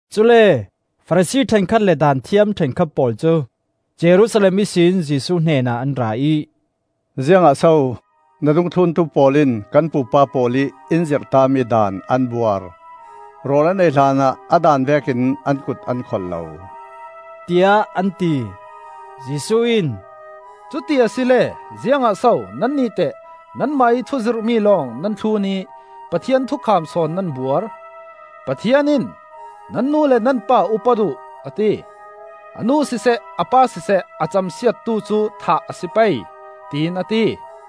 Cule Farasi hrekkhat le Daanthiam ṭhenkhat pawl cu, Jerusalem ihsin Jesuh hnenah an ra ih, “Ziangah so na dungthluntu pawl in kan pupa pawl ih in zirhtami daan an buar? Rawl an ei hlanah a daan vekin an kut an kholh lo,” tiah an ti. Jesuh in, “Cuti asile ziangah so nannih teh nanmah ih thuzirhmi lawng nan thlun ih Pathian thukham sawn nan buar? Pathian in, ‘Nan nu le nan pa upat uh,’ a ti. ‘A nu siseh, a pa siseh a camsiattu cu thah a si pei,’ tiin a ti.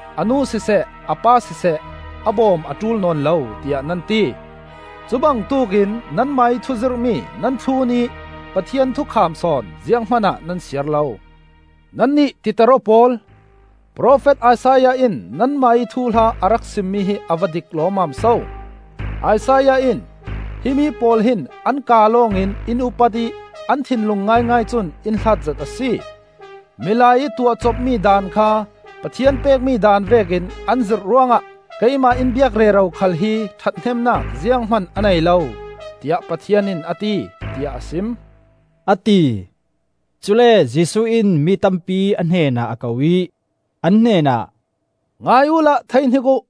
a nu siseh, a pa siseh a bawm a ṭul nawn lo, tiah nan ti. Cu bangtuk in nanmah ih thuzirhmi nan thlun ih Pathian thukham sawn ziang hmanah nan siar lo. Nannih titer-aw pawl! Profet Isaiah in nanmah ih thuhla a rak simmi hi a va dik lawmmam so! Isaiah in, ‘Himi pawl hin an kaa lawng in in upat ih an thinlung ngaingai cun in hlat zet a si. Milai ih tuahcopmi daan kha, Pathian pekmi daan vekin an zirh ruangah, Keimah in biak rero khal hi ṭhathnemnak zianghman a nei lo, tiah Pathian in a ti,’ tiah a sim,” a ti. Cule Jesuh in mi tampi a hnenah a ko ih, an hnenah, “Ngai uhla theihnik uh!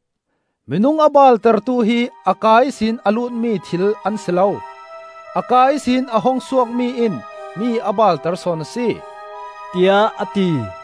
Minung a baaltertu hi a kaa ihsin a lutmi thil an si lo, a kaa ihsin a hung suakmi in mi a baalter sawn a si,” tiah a ti.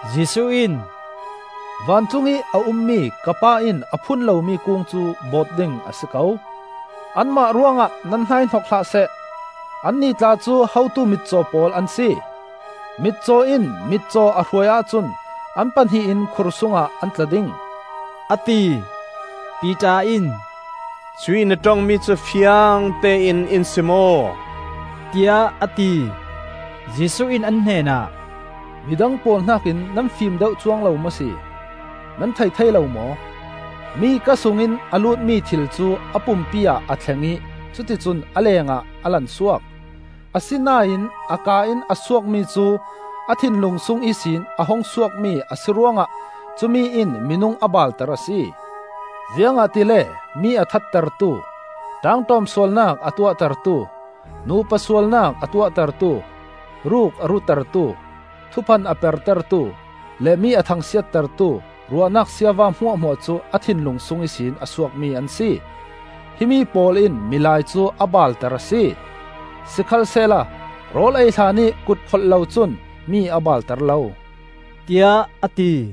Jesuh in, “Vancung i a ummi ka Pa in a phun lomi kung cu bawt ding a si ko. Anmah ruangah nan hnaihnok hlah seh! Annih tla cu hotu mitcaw pawl an si; mitcaw in mitcaw a hruai ahcun an pahnih in khursungah an tla ding,” a ti. Piter in, “Cuih na ṭongmi cu fiangtein in sim aw,” tiah a ti. Jesuh in an hnenah, “Midang pawl hnakin nan fim deuh cuang lo maw si? Nan thei thei lo maw? Mi kaa sungin a lutmi thil cu a pumpi ah a thleng ih cuticun a lengah a lansuak. Asinain a kaa in a suakmi cu a thinlung sung ihsin a hung suakmi a si ruangah cumi in minung a baalter a si. Ziangahtile mi a thattertu, ṭaangṭawm sualnak a tuahtertu, nupa sualnak a tuahtertu, ruk a rutertu, thuphan a pertertu, le mi a thangsiattertu ruahnak siava hmuahhmuah cu a thinlung sung ihsin a suakmi an si. Hi pawl in milai cu a baalter a si. Sikhalsehla rawl ei hlanih kut kholh lo cun mi a baalter lo,” tiah a ti.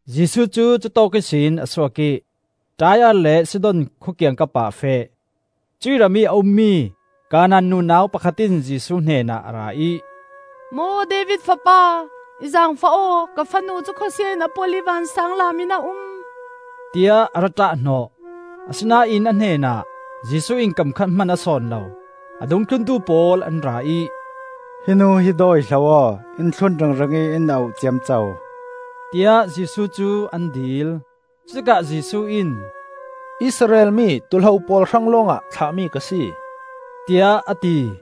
Jesuh cu cutawk ihsin a suak ih Tai-ar le Sidon khua kiangkap ah a feh. Cuih ramih a ummi Kanaan nunau pakhat in Jesuh hnenah a ra ih, “Maw David fapa, i zaangfah aw. Ka fanu cu khawsia in a polh ih vansaanglam in a um,” tiah a ra ṭahhnawh. Asinain a hnenah Jesuh in kam khat hman a sawn lo. A dungthluntu pawl an ra ih, “Hi nu hi dawihlo aw! In thlun ringring ih in auh ciamco,” tiah Jesuh cu an dil. Cutikah Jesuh in, “Israel mi tuu hlo pawl hrang lawngah thlah mi ka si,” tiah a ti.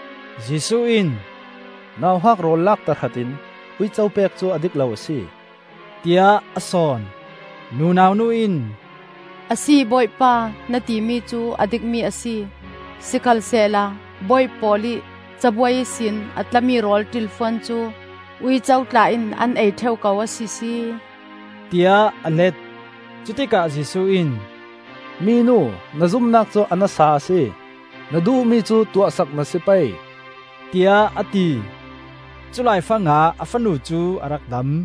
Jesuh in, “Nauhak rawl lak tahratin uico pek cu a dik lo a si,” tiah a sawn. Nunau nu in, “Asi, bawipa, na timi cu a dikmi a si. Sikhalsehla bawi pawl ih cabuai ihsin a tlami rawl ṭilfuan cu uico tla in an ei ṭheu ko a sisi!” tiah a let. Cutikah Jesuh in, “Minu, na zumnak cu a nasa a si. Na duhmi cu tuahsak na si pei,” tiah a ti. Culaifang ah a fanu cu a rak dam.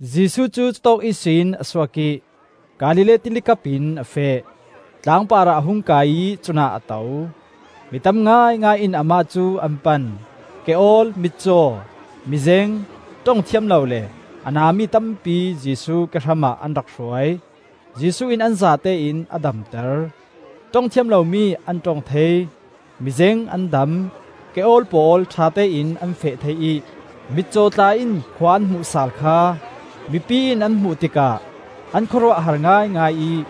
Jesuh cu cutawk ihsin a suak ih Galilee Tili kapin a feh. Tlang parah a hung kai ih cunah a to. Mi tam ngaingai in amah cu an pan. Ke-awl, mitcaw, mizeng, ṭong thiam lo le a na mi tampi Jesuh ke hramah an rak hruai. Jesuh in an zatein a damter. Ṭong thiam lomi an ṭong thei, mizeng an dam, ke-awl pawl ṭhatein an feh thei ih mitcaw tla in khua an hmuh sal kha mipi in an hmuh tikah an khawruah a har ngaingai ih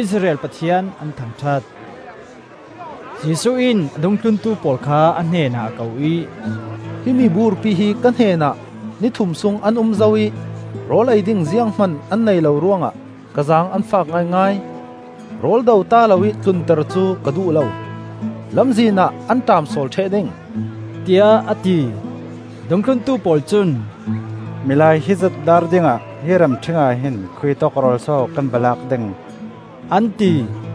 Israel Pathian an thangṭhat. Jesuh in a dungthlun pawl kha a hnenah a ko ih, “Hi miburpi hi ka hnenah ni thum sung an um zo ih rawl ei ding zianghman an neih lo ruangah ka zaang an fak ngaingai. Rawl do ta loih tlunter cu ka duh lo, lamzin ah an ṭaamsawl ṭheh ding,” tiah a ti. Dungthluntu pawl cun, “Milai hizat daar dingah hi ramṭhing ahhin khuitawk rawl so kan va lak ding?” an ti.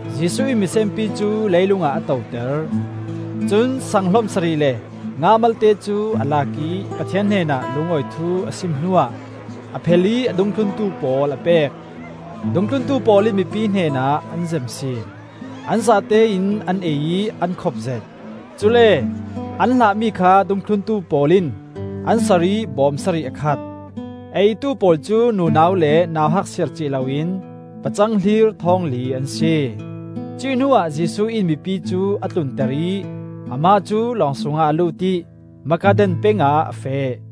Jesuh in misenpi cu leilung ah a toter. Cun saang hlom sarih le nga malte cu a lak ih Pathian hnenah lungawi thu a sim hnuah a phel ih a dungthlun pawl a pek. Dungthluntu pawl in mipi hnenah an zem sin. An zatein an ei ih an khopzet. Cule an hlahmi kha dungthluntu pawl in an sar ih bawm sarih a khat. A eitu pawl cu nunau le nauhak siarcih loin pacang hlir thawngli an si. Cuih hnuah Jesuh in mipi cu a tlunter ih amah cu lawng sungah a lut ih Magadan peng ah a feh.